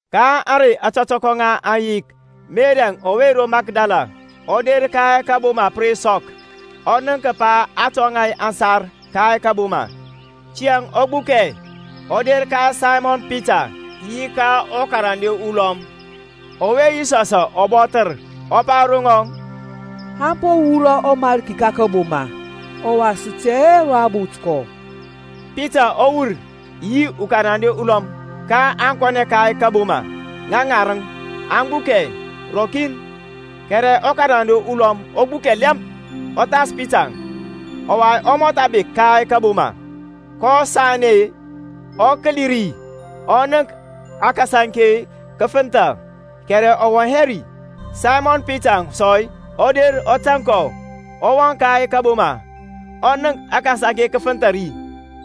Ka ȧŋrey ȧtɔtɔkɔ ŋa ȧŋyik Meri ɔwe ro Makdala ɔ der ka kȧboma pə re sɔk, ɔ nənk kəpa a tɔŋa aŋsar ka kȧboma. Tiyȧŋ ɔ gbukɛ, ɔ der ka Saymɔn Pita, yi ka ɔkarande ulɔm, ɔwe Yisɔsȧŋ ɔ bɔthər, ɔ pa ro ŋaŋ, Aŋ po wurɔ ɔMarki ka kȧboma, ɔwa sə tɛ hɛ ro a bot kɔ. Pitaŋ ɔ wur, yi ɔkarande ulɔm, kaŋ kɔnɛ ka kȧboma. Ŋa ŋarəŋȧŋ aŋ gbukɛ rɔkin; kɛrɛ ɔkarande ulɔm ɔ gbukɛ lɛmp ɔ thas Pitaŋ, ɔwa ɔ mɔtha bek ka kȧboma. kɔ sanɛ-e, ɔ kəli ri, ɔ nənk akasaŋke kə fənthȧ; kɛrɛ ɔ wɔŋ hɛ ri. Saymɔn Pita sɔ ɔ der ɔ tȧŋ kɔ, ɔ wɔŋ ka kȧboma; ɔ nənk akasaŋke kə fənthȧ ri,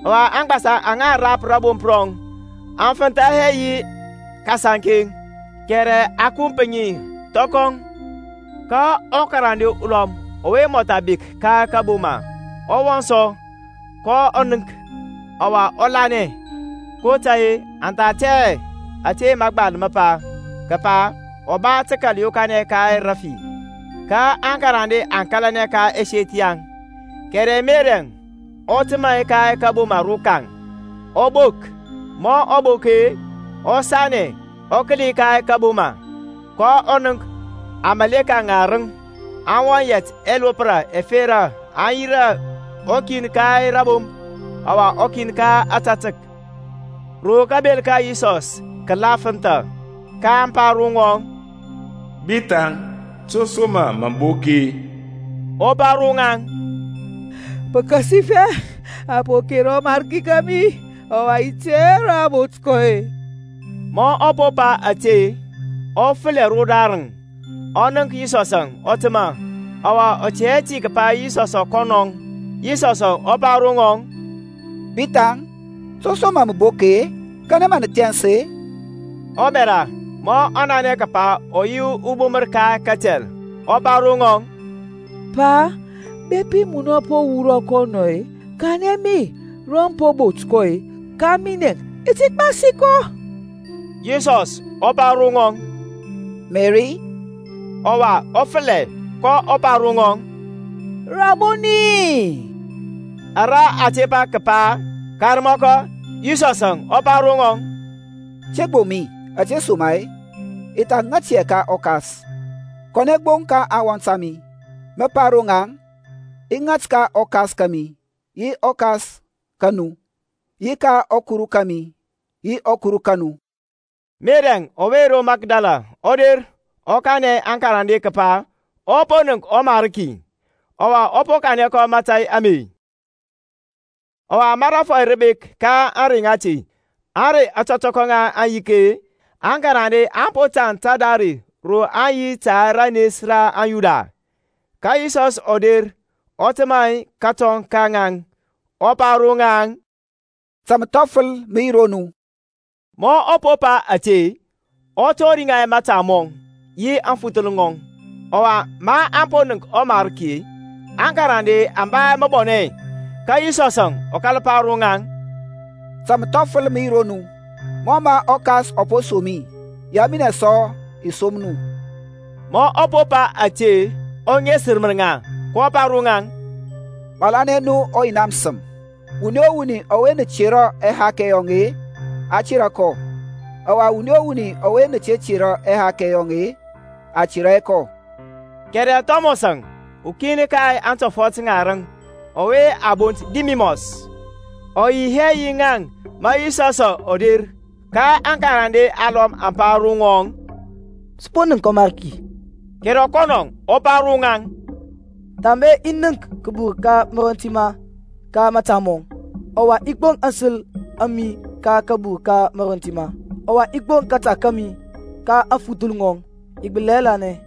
ɔwa aŋgbasa aŋa a rapər rȧbomp rɔŋ, aŋ fənthȧ hɛ yi akasaŋke, kɛrɛ a kump ŋi thɔkɔ. Ka ɔkarande ulɔm ɔwe mɔtha bek ka kȧboma ɔ wɔŋ sɔ, kɔ nənk, ɔwa ɔ lanɛ. kotȧy-e, aŋ tha tɛ hɛ ȧte mȧgbal mə pa, kəpa ɔ ba tə kəkal yokanɛ ka rafi. Ka aŋkarande aŋ kȧlanɛ ka ɛseth yaŋ. Kɛrɛ Merɛŋ ɔ təmȧ ka kȧboma rokaŋ ɔ bok: ma ɔ bok-e, ɔ sanɛ ɔ kəli ka kȧboma; kɔ nənk amaleka ŋarəŋ aŋ wɔŋ yɛt ɛlopra ɛfera aŋ yirȧ, ukin ka rȧbomp, ɔwa ukin ka ȧtȧtək, ro kabel ka Yisɔs kə la fənthȧ. kaŋ pa ro ŋɔŋ, Bithaŋ, to som mȧ mə bok-e? Ɔ pa ro ŋaŋ, Pəkasifɛ a po kera ɔMarki kȧmi, ɔwa i tɛ hɛ ro a bot kɔ-e. Ma ɔ po pa ȧte, ɔ fəlɛ rodarəŋ, ɔ nənk Yisɔsȧŋ ɔ təmȧ, ɔwa ɔ tɛ hɛ ti kəpa Yisɔsȧŋ kɔnɔŋ. Yisɔsȧŋ ɔ pa ro ŋɔŋ, Bithaŋ, to som mȧ mə bok-e? kanɛ mȧ mə thɛns-e? Ɔbɛra, ma ɔ nanɛ kəpa ɔ yi ɔbumər ka katɛl, ɔ pa ro ŋɔŋ, Pa, bepi munɔ mə po wurɔ kɔ anɔ-e, kanɛ mi ro mə po bot kɔ, ka minɛ i ti gbasi kɔ. Yisɔs ɔ pa ro ŋɔŋ, Meri. Ɔwa ɔ fəlɛ, kɔ pa ro ŋɔŋ, Rabɔni; ara a tepa kəpa, Karmɔkɔ. Yisɔsȧŋ ɔ pa ro ŋɔŋ, Te gboŋ mi; ȧtesoma-e, i tha ŋat hɛ ka ɔKas: kɔnɛ gbo ka aŋwɔnt a mi, mə pa ro ŋaŋ, I ŋat ka ɔKas kȧmi yi ɔKas ka nu; yi ka ɔKuru kȧmi, yi ɔKuru ka nu. Meri ɔwe ro Makdala ɔ der ɔ kanɛ aŋkarande kəpa ɔ po nənk ɔMarki, ɔwa ɔ po kanɛ kɔ mȧtȧy ame. Ɔwa ma rȧfɔy rə bek ka ȧŋrey ŋati, ȧŋrey ȧtɔtɔkɔ ŋa aŋyik-e, aŋkarande aŋ po tȧŋ tadare ro aŋ yi ta ranes ra aŋYuda. Ka Yisɔsȧŋ ɔ der ɔ təmȧ kətɔŋ ka ŋaŋ, ɔ pa ro ŋaŋ, Ta məthɔfəl mə yi ro nu. Ma ɔ po pa ȧte, ɔ tɔri ŋa mȧta mɔŋ yi aŋfuthəl ŋɔŋ. Ɔwa, maŋ po nənk ɔMariki-e, aŋkarande aŋ ba məbɔnɛ. Ka Yisɔsȧŋ ɔ kȧl pa ro ŋaŋ, Ta məthɔfəl mə yi ro nu: mɔ mə ɔKas ɔ po som mi, yaŋ minɛ sɔ i som nu. Ma ɔ po pa ȧte, ɔ ŋesmər ŋa, kɔ pa ro ŋaŋ, Malanɛ nu ɔYina məsəm: wuni o wuni ɔwe nə tera ɛhakɛ yɔŋ-e, a tera kɔ, ɔwa wuni o wuni ɔwe nə te tera ɛhakɛ yɔŋ-e, a tera hɛ kɔ. Kɛrɛ Thɔmɔsȧŋ ukin ka antɔfɔt ŋarəŋ, ɔwe a bont Didimɔs, ɔ yi hɛ yi ŋaŋ ma Yisɔsȧŋ ɔ der. Ka aŋkarande alɔm aŋ pa ro ŋɔŋ, Sə po nənk ɔMarki. Kɛrɛ kɔnɔ ɔ pa ro ŋaŋ, Thambe i nənk kabur ka marɔntima ka mȧta mɔŋ, ɔwa i gboŋ aŋsəl a mi ka kabur ka marɔntima, ɔwa i gboŋ kȧta kȧmi ka aŋfuthəl ŋɔŋ, i gbəli hɛ lanɛ.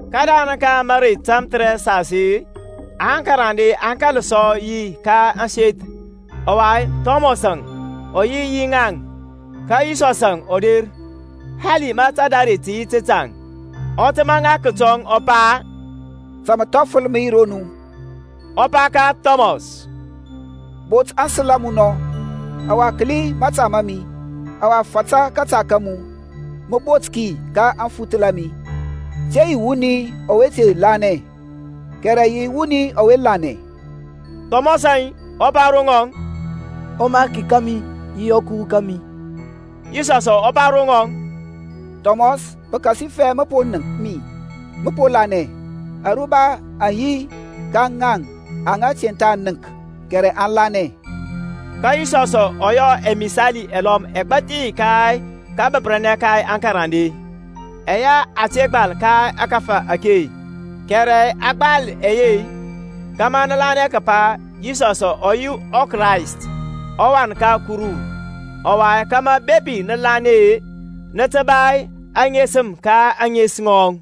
Kədarəŋ ka mərey tamthərɛsas-e aŋkarande aŋ kȧl sɔ yi ka ȧŋseth, ɔwa Thɔmɔsȧŋ ɔ yi yi ŋaŋ: ka Yisɔsȧŋ ɔ der, hali ma tadare tə yi tətaŋ, ɔ təmȧ ŋa kətɔŋ, ɔ pa, Ta məthɔfəl mə yi ro nu. Ɔ pa ka Thɔmɔs, Bot aŋsəl a mu nɔ, ɔwa kəli mȧta ma mi; ɔwa fata kȧta ka mu, mə bot ki ka aŋfuthəl a mi: te yi wuni ɔwe te lanɛ, kɛrɛ yi wuni ɔwe lanɛ. Thɔmɔsȧŋ ɔ pa ro ŋɔŋ, ƆMariki kȧmi yi ɔKuru kȧmi. Yisɔsȧŋ ɔ pa ro ŋɔŋ, Thɔmɔs pəkasifɛ mə po nənk mi, mə po lanɛ; aruba aŋ yi ka ŋaŋ aŋa te tha nənk, kɛrɛ aŋ lanɛ. Ka Yisɔsȧŋ ɔ yɔ ɛmisali ɛlɔm ɛgbathi ka kabəpər ka aŋkarande, ɛyɛ a te gbal ka ȧkȧfȧ ake: kɛrɛ a gbal ɛye, kȧmȧ nə lanɛ kəpa Yisɔsȧŋ ɔ yi ɔKrayst, ɔWan ka Kuru, ɔwa kȧmȧ bepi nə lanɛ-e, nə tə ba aŋesəm ka ȧŋes ŋɔŋ.